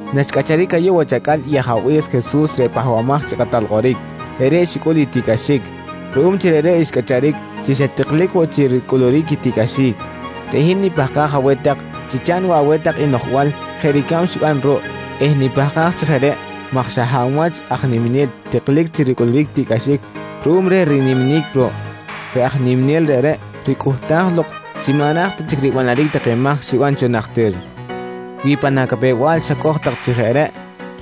Naxcꞌacharic ayuꞌ wach acꞌal i Ajabe̱s Jesus reꞌ Pahbamaj chi Kꞌatal Kꞌoric, reꞌreꞌ xicꞌul i tiꞌcꞌaxic. Ruꞌum chi reꞌreꞌ xcꞌacharic chi xa tiklic woꞌ chi ricꞌuluric i tiꞌcꞌaxic, reꞌ hin nipahkaj aweh tak chi chaꞌn woꞌ aweh tak i noꞌjbal jeꞌ ricab xiban ruꞌ eh nipahkaj chi jeꞌ reꞌ maj xa hab wach aj niminel tiklic chi ricꞌuluric tiꞌcꞌaxic ruꞌum reh riniminic ruꞌ, reꞌ aj niminel reꞌreꞌ ricꞌuhtaj lok chi maꞌ ra̱j ta chic ribanaric i take mahc xiban cho najtir. Wi pan acapew-bal xacoj tak chi jeꞌ reꞌ,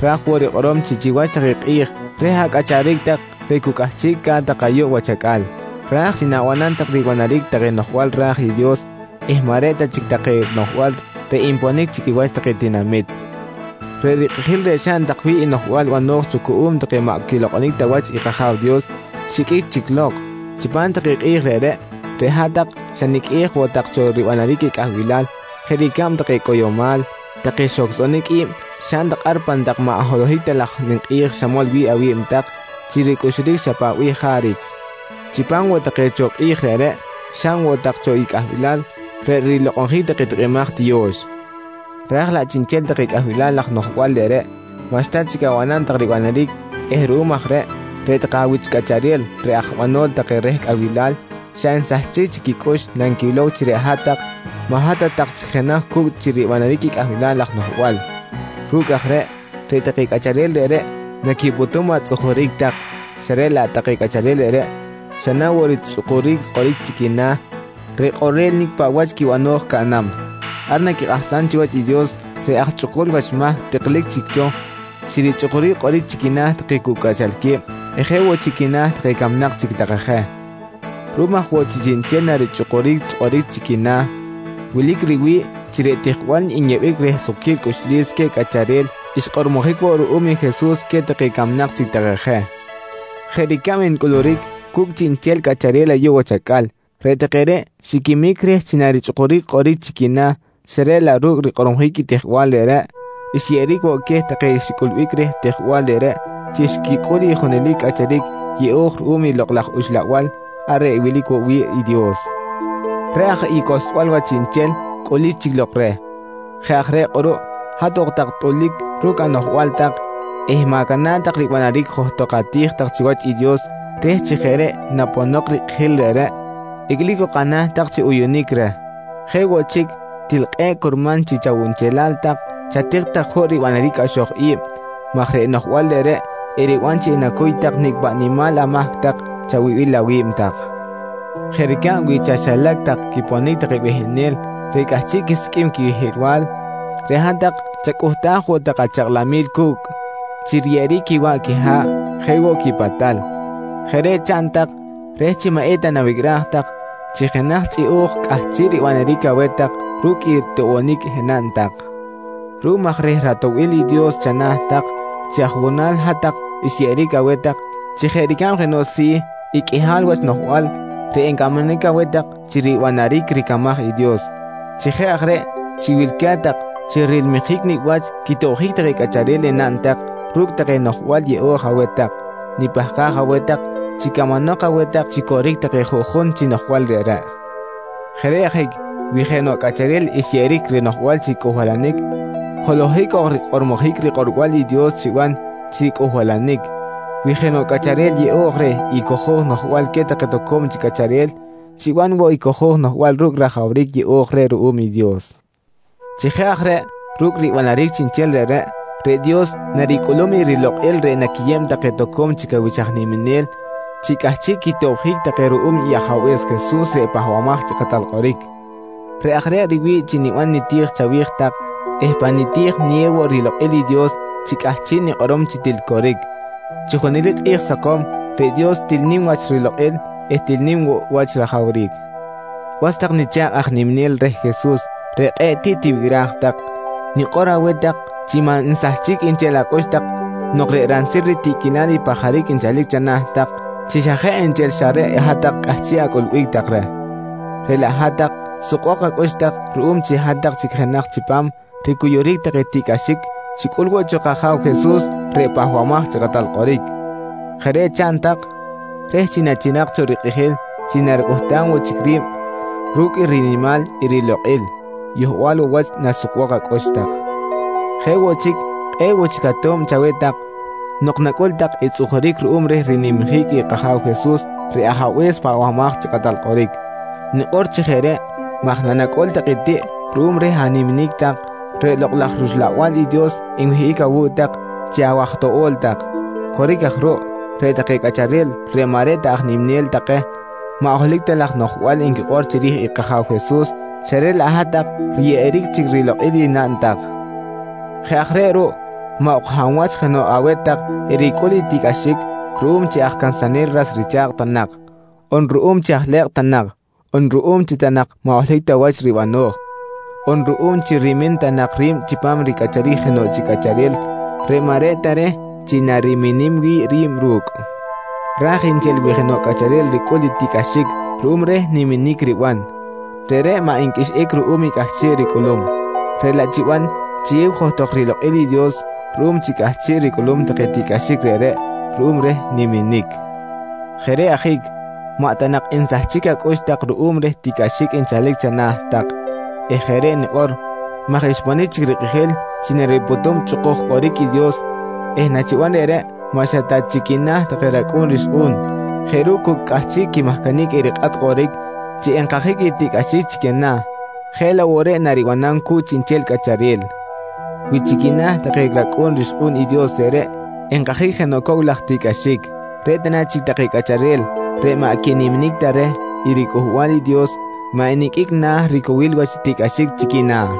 raj woꞌ rikꞌorom chi chiwach take kꞌi̱j reh acꞌacharic tak reꞌ cu cꞌahchiꞌca̱t tak ayuꞌ wach acꞌal, ra̱j chi na̱banam tak ribanaric take noꞌjbal ra̱j i Dios eh maꞌ reꞌ ta chic take noꞌjbal reꞌ nponic chi quiwach take tinamit. Reꞌ rikꞌijil reꞌ xaꞌn tak wi̱ꞌ i noꞌjbal bano̱j cho cuꞌum take maꞌ quilokꞌonic ta wach i kAja̱w Dios xiqꞌuic chic lok. Chipam take kꞌi̱j reꞌreꞌ, reꞌ hat-tak xaniqꞌuej woꞌ tak cho ribanaric i cꞌahbilal jeꞌ ricab take cꞌoyomal, take xohcꞌsonic i̱b xaꞌn tak ar pan tak maꞌ holohic ta laj ninkꞌi̱j xamol wi̱ꞌ awi̱b tak chi ricꞌuxuric xa paꞌ bih jaric. Chipam woꞌ take cho kꞌi̱j reꞌreꞌ, xaꞌn woꞌ tak cho i cꞌahbilal reꞌ rilokꞌonjic take tikꞌimaj tiyo̱x, raj laꞌ chiꞌnchel take cꞌahbil laj noꞌjbal reꞌreꞌ maꞌxta chic abanam tak ribanaric eh ruꞌum aj reꞌ, reꞌ take awich cꞌacharel reꞌ aj banol take reh cꞌahbilal, xa nsahchic chic quicꞌux nanquilow chi reꞌ hat-tak maꞌ hat ta tak chic jenaj cu̱cꞌ chi ribanaric i cꞌahbil laj noꞌjbal. Ru̱cꞌ aj reꞌ, reꞌ take cꞌacharel reꞌreꞌ naquipꞌutum atzꞌujuric tak xa reꞌ laꞌ take cꞌacharel reꞌreꞌ xa na woꞌ richꞌukuric kꞌoric chi quina̱ reꞌ kꞌorel nicꞌ paꞌ wach quibano̱j caꞌnam. Ar naquikꞌahsam chiwach i Dios reꞌ aj chꞌukul wach mahc tiklic chic cho chi richꞌukuric kꞌoric chi quina̱ take cu cꞌachalque̱b eh jeꞌ woꞌ chi quina̱ take camnak chic take je. Ruꞌum aj woꞌ chi chiꞌnchel narichꞌukuric kꞌoric chi quina̱, wilic riwi̱ꞌ chi reꞌ tijbal nyeꞌbic reh sukquil cꞌuxlis queh cꞌacharel xkꞌormojic woꞌ ruꞌum i Jesus queh take camnak chic take je. Jeꞌ ricab ncꞌuluric cu̱cꞌ chiꞌnchel cꞌacharel ayuꞌ wach acꞌal, reꞌ take reꞌ xiquimic reh chi narichꞌukuric kꞌoric chi quina̱ xa reꞌ laꞌ ru̱cꞌ rikꞌormojic i tijbal reꞌreꞌ, xyeꞌeric woꞌ queh take xicꞌulbic reh tijbal reꞌreꞌ chi xquicꞌul i junelic cꞌacharic yeꞌo̱j ruꞌum i Lokꞌ laj Uxlabal ar reꞌ wilic woꞌ wi̱ꞌ i Dios. Reꞌ aj i cohlsbal wach chiꞌnchel cꞌulic chic lok reh. Jeꞌ aj reꞌ kꞌuruꞌ hat ok tak tꞌulic ru̱cꞌ anoꞌjbal tak eh ma̱cana̱ꞌ tak ribanaric johtok ati̱j tak chiwach i Dios reh chi jeꞌ reꞌ naponok i kꞌijil reꞌreꞌ icꞌlic ok ana̱ tak chi uyunic reh. Jeꞌ woꞌ chic til kꞌe̱ꞌ curman chi chawunchelal tak chatik tak juꞌ ribanaric i cꞌaxoj i̱b maj reꞌ noꞌjbal reꞌreꞌ eriban chi enacuy nicꞌ paꞌ nimal amahc tak chawibil awi̱b tak. Jeꞌ ricab wi chaxilac tak quiponic take behenel reꞌ cꞌahchiꞌ quisiqꞌuim quihiꞌlbal, reꞌ hat-tak chacꞌuhtaj woꞌ tak achakꞌlamil cu̱cꞌ chi riyeꞌeric quiwaꞌ quiha̱ꞌ jeꞌ woꞌ quipatal. Jeꞌ reꞌ chaꞌn tak reh chi maꞌ eta nawicꞌraj tak chi jenaj chꞌiꞌo̱j cꞌahchiꞌ ribanaric aweh tak ru̱cꞌ i toꞌbonic enaꞌn tak. Ruꞌum aj reh ratoꞌbil i Dios chana̱ tak, chi ajuꞌjunal hat-tak xyeꞌeric aweh tak chi jeꞌ ricab jenoꞌ si̱ i qꞌuihal wach noꞌjbal reꞌ encamanic aweh tak chi ribanaric ricamaj i Dios. Chi jeꞌ aj reꞌ chi wilca̱t tak chi rilmijic nicꞌ wach quitobjic take cꞌacharel enaꞌn tak ru̱cꞌ take noꞌjbal yeꞌo̱j aweh tak, nipahkaj aweh tak chi camanok aweh tak chi coric take juꞌjun chi noꞌjbal reꞌreꞌ. Jeꞌ reꞌ ajic wi jenoꞌ cꞌacharel xyeꞌeric rinoꞌjbal chi cꞌuhbalanic, holohic ok rikꞌormojic rikꞌorbal i Dios chiban chi cꞌuhbalanic. Wi jenoꞌ cꞌacharel yeꞌo̱j reh i cojo̱j noꞌjbal queh take toco̱m chic cꞌacharel, chiban woꞌ i cojo̱j noꞌjbal ru̱cꞌ rajawric yeꞌo̱j reh ruꞌum i Dios. Chi jeꞌ aj reꞌ ru̱cꞌ ribanaric chiꞌnchel reꞌreꞌ, reꞌ Dios naricꞌulum i rilokꞌil reꞌ naquiyeb take toco̱m chic awich aj niminel chi cꞌahchiꞌ quitobjic take ruꞌum i Ajabe̱s Jesus reꞌ Pahbamaj chi Kꞌatal Kꞌoric. Reꞌ aj reꞌ riwi̱ꞌ chi niban niti̱j chawi̱j tak eh pa niti̱j niyew woꞌ rilokꞌil reh i Dios chi cꞌahchiꞌ nikꞌorom chi til coric, chi junelic kꞌi̱j sakom reꞌ Dios til nim wach rilokꞌil eh til nim woꞌ wach i rajawric. Was tak nicha̱kꞌ aj niminel reh Jesus reꞌ kꞌe̱ꞌ tiꞌ tiwicꞌraj tak, nikꞌor aweh tak chi maꞌ nsahchic nchel acꞌux tak nok reꞌ ransil ritiꞌquilal i pajaric nchalic chana̱ tak chi xa jeꞌ nchel xa reꞌ hat-tak cꞌahchiꞌ acꞌulbic tak reh. Reꞌ laꞌ hat-tak sukbok acꞌux tak ruꞌum chi hat-tak chic jenaj chipam ricuyuric take tiꞌcꞌaxic xicꞌul woꞌ cho kAja̱w Jesus reꞌ Pahbamaj chi Kꞌatal Kꞌoric. Jeꞌ reꞌ chaꞌn tak reh chi nachirak cho rikꞌijil chi naricꞌuhtam woꞌ chic ri̱b ru̱cꞌ i rinimal i rilokꞌil, yohbal woꞌ wach nasukbok acꞌux tak. Jeꞌ woꞌ chic, kꞌe̱ꞌ woꞌ chic ato̱b chaweh tak nok nacꞌul tak i tzꞌujuric ruꞌum reh rinimjic i kAja̱w Jesus reꞌ Ajabe̱s Pahbamaj chi Kꞌatal Kꞌoric. Nikꞌor chi jeꞌ reꞌ maj nanacꞌul tak i tiꞌ ruꞌum reh animinic tak, reꞌ Lokꞌ laj rUxlabal i Dios nwihꞌic awu̱cꞌ tak chi awaj toꞌo̱l tak. Coric aj ruꞌ, reꞌ take cꞌacharel reꞌ maꞌ reꞌ ta aj niminel take maꞌ holohic ta laj noꞌjbal nquikꞌor chiri̱j i kAja̱w Jesus xa reꞌ laꞌ hat-tak riyeꞌeric chic rilokꞌil i naꞌn tak. Jeꞌ aj reꞌ ruꞌ maꞌ ok hab wach jenoꞌ aweh tak ericꞌul i tiꞌcꞌaxic ruꞌum chi aj cansanel ras richa̱kꞌ ta nak, on ruꞌum chi aj lekꞌ ta nak, on ruꞌum chi ta nak maꞌ holohic ta wach ribano̱j, on ruꞌum chi rimin ta nak ri̱b chipam ricꞌacharic jenoꞌ chic cꞌacharel reꞌ maꞌ reꞌ ta reh chi nariminim wi̱ꞌ ri̱b ru̱cꞌ. Ra̱j nchel wi̱ꞌ jenoꞌ cꞌacharel ricꞌul i tiꞌcꞌaxic ruꞌum reh niminic riban, reꞌreꞌ maꞌ nqꞌuixꞌic ruꞌum i cꞌahchiꞌ ricꞌulum, reꞌ laꞌ chiban chiyew johtok rilokꞌil i Dios ruꞌum chi cꞌahchiꞌ ricꞌulum take tiꞌcꞌaxic reꞌreꞌ ruꞌum reh niminic. Jeꞌ reꞌ ajic, maꞌ ta nak nsahchic acꞌux tak ruꞌum reh tiꞌcꞌaxic nchalic chana̱ tak eh jeꞌ reꞌ nikꞌor maj xponic chic rikꞌijil chi naripꞌutum chꞌukuj kꞌoric i Dios eh nachiban reꞌreꞌ maꞌ xa ta chi quina̱ take racꞌu̱n rixkꞌu̱n jeꞌ ru̱cꞌ cu cꞌahchiꞌ quimahcanic erikꞌat kꞌoric chi enkajic i tiꞌcꞌaxic chi quina̱ jeꞌ laꞌ woꞌ reꞌ naribanam cu̱cꞌ chiꞌnchel cꞌacharel. Wi chi quina̱ take racꞌu̱n rixkꞌu̱n i Dios reꞌreꞌ enkajic jenoꞌ cow laj tiꞌcꞌaxic, reꞌ ta na chic take cꞌacharel reꞌ maꞌ quiniminic ta reh i riCꞌuhbal i Dios maꞌ eniqꞌuic na̱ ricowil wach tiꞌcꞌaxic chi quina̱?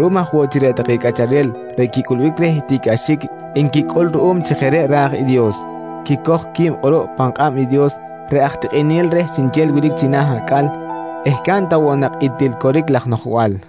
Ruꞌum aj woꞌ chi reꞌ take cꞌacharel reꞌ quicꞌulbic reh i tiꞌcꞌaxic nquicꞌul ruꞌum chi jeꞌ reꞌ ra̱j i Dios, quicoj qui̱b kꞌuruꞌ pan kꞌab i Dios reꞌ aj tikꞌinel reh chiꞌnchel wilic china̱ acꞌal eh caꞌn ta woꞌ nak i til coric laj noꞌjbal.